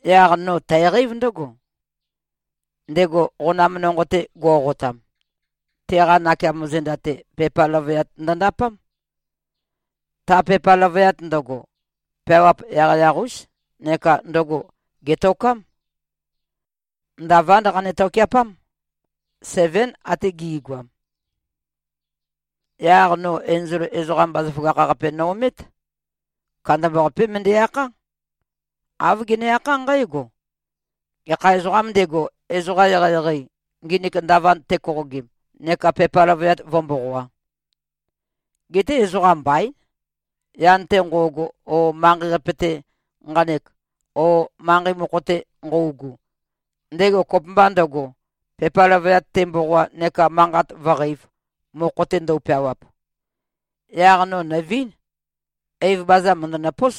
Yaq no tæqeív ndǿgo: Ndego qonam nonqo-te go꞉qotam, teqa nakeamo zenda-te, pepa løvøyat ndøndapám. Ta pepa løvøyat ndøgo, peawap yaqyaq-ús neka ndøgo gètokám. Ndavánd qane-tokeapám. Sevén ate gi꞉goam. Yaq no enzol ezoqam bazaføgakh-qape no-omét. Kandambaqapé møndæ-akhá. Āv gene-akhá nqǽgo, “Gekha ezoqâm ndego, ezoqa eqeieqei, nginik ndavand tekoqogim neka pepa løvøyat vǿ-mboqoā?” Geté ezoqam mbaín, yan-te nqo꞉go o manqei-qape-te nqanek o manqei mokho-te nqøugu, ndego kopømba ndøgo, pepa løvøyat temboqoa neka manqat vǿqeīv, mokho-te ndøu-peawap. Yaq no nø̀vín. Eiv baza mø̀ndønøpós,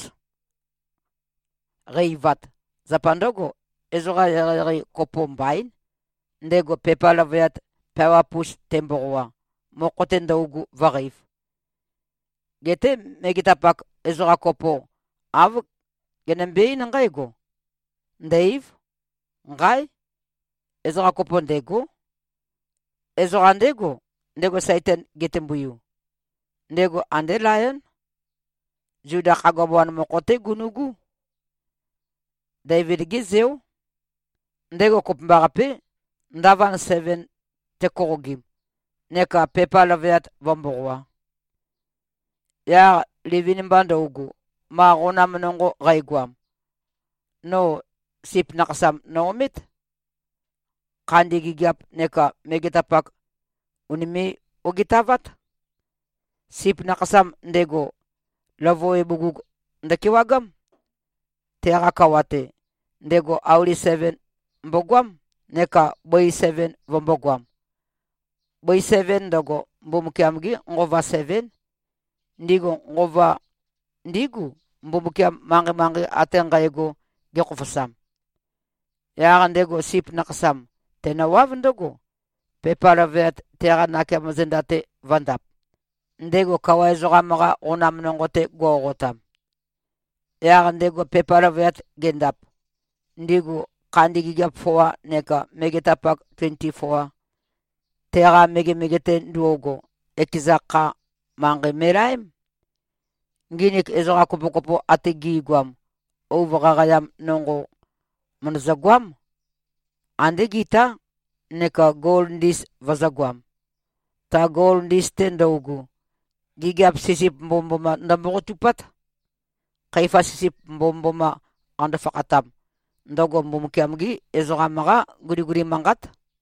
qæ-eivat. Zapa ndǿgo, ezoqa eqeieqei kopo mbaín, ndego pepa løvøyat peawap-us temboqoa, mokho-te ndøugu vǿe-qeīv. Geté megetapak ezoqa kopo, āv genømbe-eín nqǽgo, “Ndò-ei᷄v. Nqáe! Ezoqa kopo ndêgó. Ezoqa ndégo, ndego Saitan getømbuiu. Ndego andé Layón. Zuda khagua bawan mokho-té gunu꞉gú. Deivid-gé zeó. Ndego kopømbaqapé, ndavand seven tekoqogim neka pepa løvøyat vǿ-mboqoā. Yaq livin-mba ndøugu, ma qonam nonqo qægoam, no Sip Nakhasam no-omét. Khandi gigiap neka megetapak, ùnime꞉-ogitavát. Sip Nakhasam ndego, løvøwe bugug ndøkewagám. Teqa kawa-te, ndego auli seven mbogoám, neka bøi seven vømbōgoam. Bøi seven ndøgo, Mbumbukiam-gí nqova sevén. Ndigu nqova ndígu, Mbumbukiam manqei-manqei ate nqægo gekhofosam. Yaq ndego Sip Nakhasam, tenøwáv ndǿgo, pepa løvøyat, teqa nakeamo zenda-te vø̄ndap, ndego kawa ezoqam-qa qonam nonqo-te go꞉qotam. Yaq ndego pepa løvøyat gendap, ndigu khandi gigiap foa neka megetapak tuenti-foa, teqa megemege-te ndo꞉go, ekeza kha, manqei me꞉laém. Nginik ezoqa kopokopo ate gi꞉goam, ouv qaqaeam nonqo, mø̀ndøzø-goám, ande gitá, neka gol ndis vøzø̄goam. Ta gol ndis-te ndøugu, gigiap sisip mbomømboma ndømboqotupát. Khøifa sisip mbomømboma, qando-fakhatam, ndøgo Mbumbukiam-gí ezoqam-qá guliguli manqát.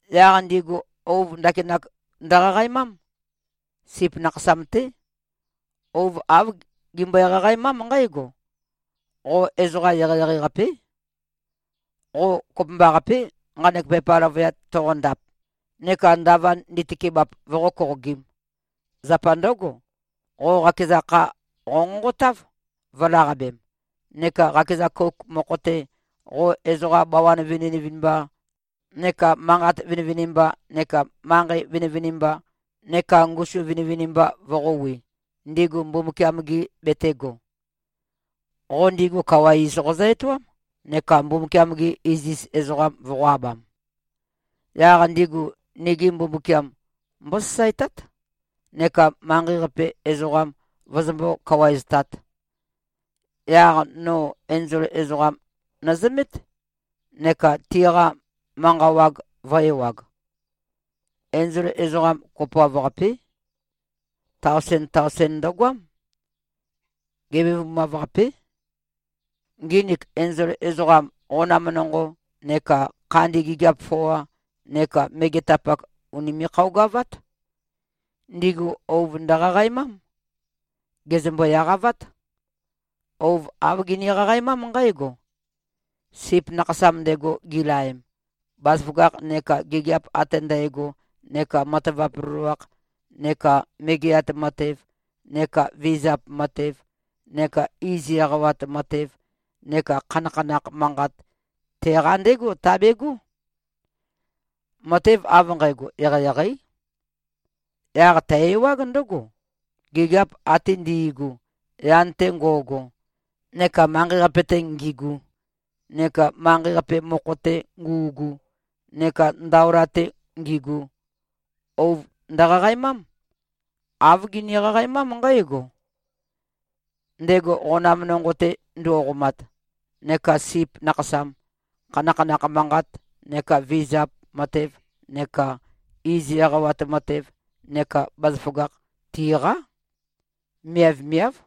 Yaq ndigu ouv ndakinak ndøqaqaemám. Sip Nakhasam-té. Ouv āv gimbøe-qaqaemám nqǽgo: Qo ezoqa eqeieqei-qapé. Qo kopømbaqapé, nqanek pepa løvøyat toqondap neka ndavand nditøkebap, voqó-koqogīm. Zapa ndǿgo, qo qakeza kha qonqonqotáv, vø̄laqabem, neka qakeza kouk mokho-te, qo ezoqa bawan vinivinimba neka manqat vinivinimba neka manqei vinivinimba neka ngusu vinivinimba voqōwi, ndigu Mbumbukiam-gi betēgo. Qo ndigu kawa iz qozø-etoám neka Mbumbukiam-gi iziz ezoqam voqō-abam. Yaq ndigu nigi Mbumbukiam mbósasaetát, neka manqei-qape ezoqam vøzømbó-kawaeztāt.” Yaq no enzol ezoqam nøzømét, neka tiqa manqa wag vø̄e-ewag. Enzol ezoqam kopoav-qapé. Taosen-taosen ndøgoám. Gevebumav-qapé. Nginik enzol ezoqam, qonam nonqo neka khandi gigiap foa neka megetapak, ùnime꞉-khøogavát. Ndigu ouv ndøqaqaemám. Gèzømbo-eqavát. Ouv āv gini-qaqaemám nqǽgo, “Sip Nakhasam ndego, gilaem, bazaføgakh neka gigiap ate ndægo neka matavap loloakh neka megeat matev neka vizap matev neka iz eqawat matev neka khanakhanakh manqat, teqa ndégo tabegó. Matev av nqægo eqeieqeí.” Yaq tæ-ewág ndǿgo: Gigiap ate ndi꞉gu, yan-te ngo꞉go neka manqei-qape-te ngigu neka manqei-qape mokho-te ngu꞉gu neka ndaola-te ngigu, ouv ndøqaqaemám. Āv gini-qaqaemám nqǽgo, “Ndego qonam nonqo-te ndo꞉qomat neka Sip Nakhasam, khanakhanakh manqat neka vizap matev neka iz eqawat matev neka bazaføgakh tiqá. Miavmiáv.”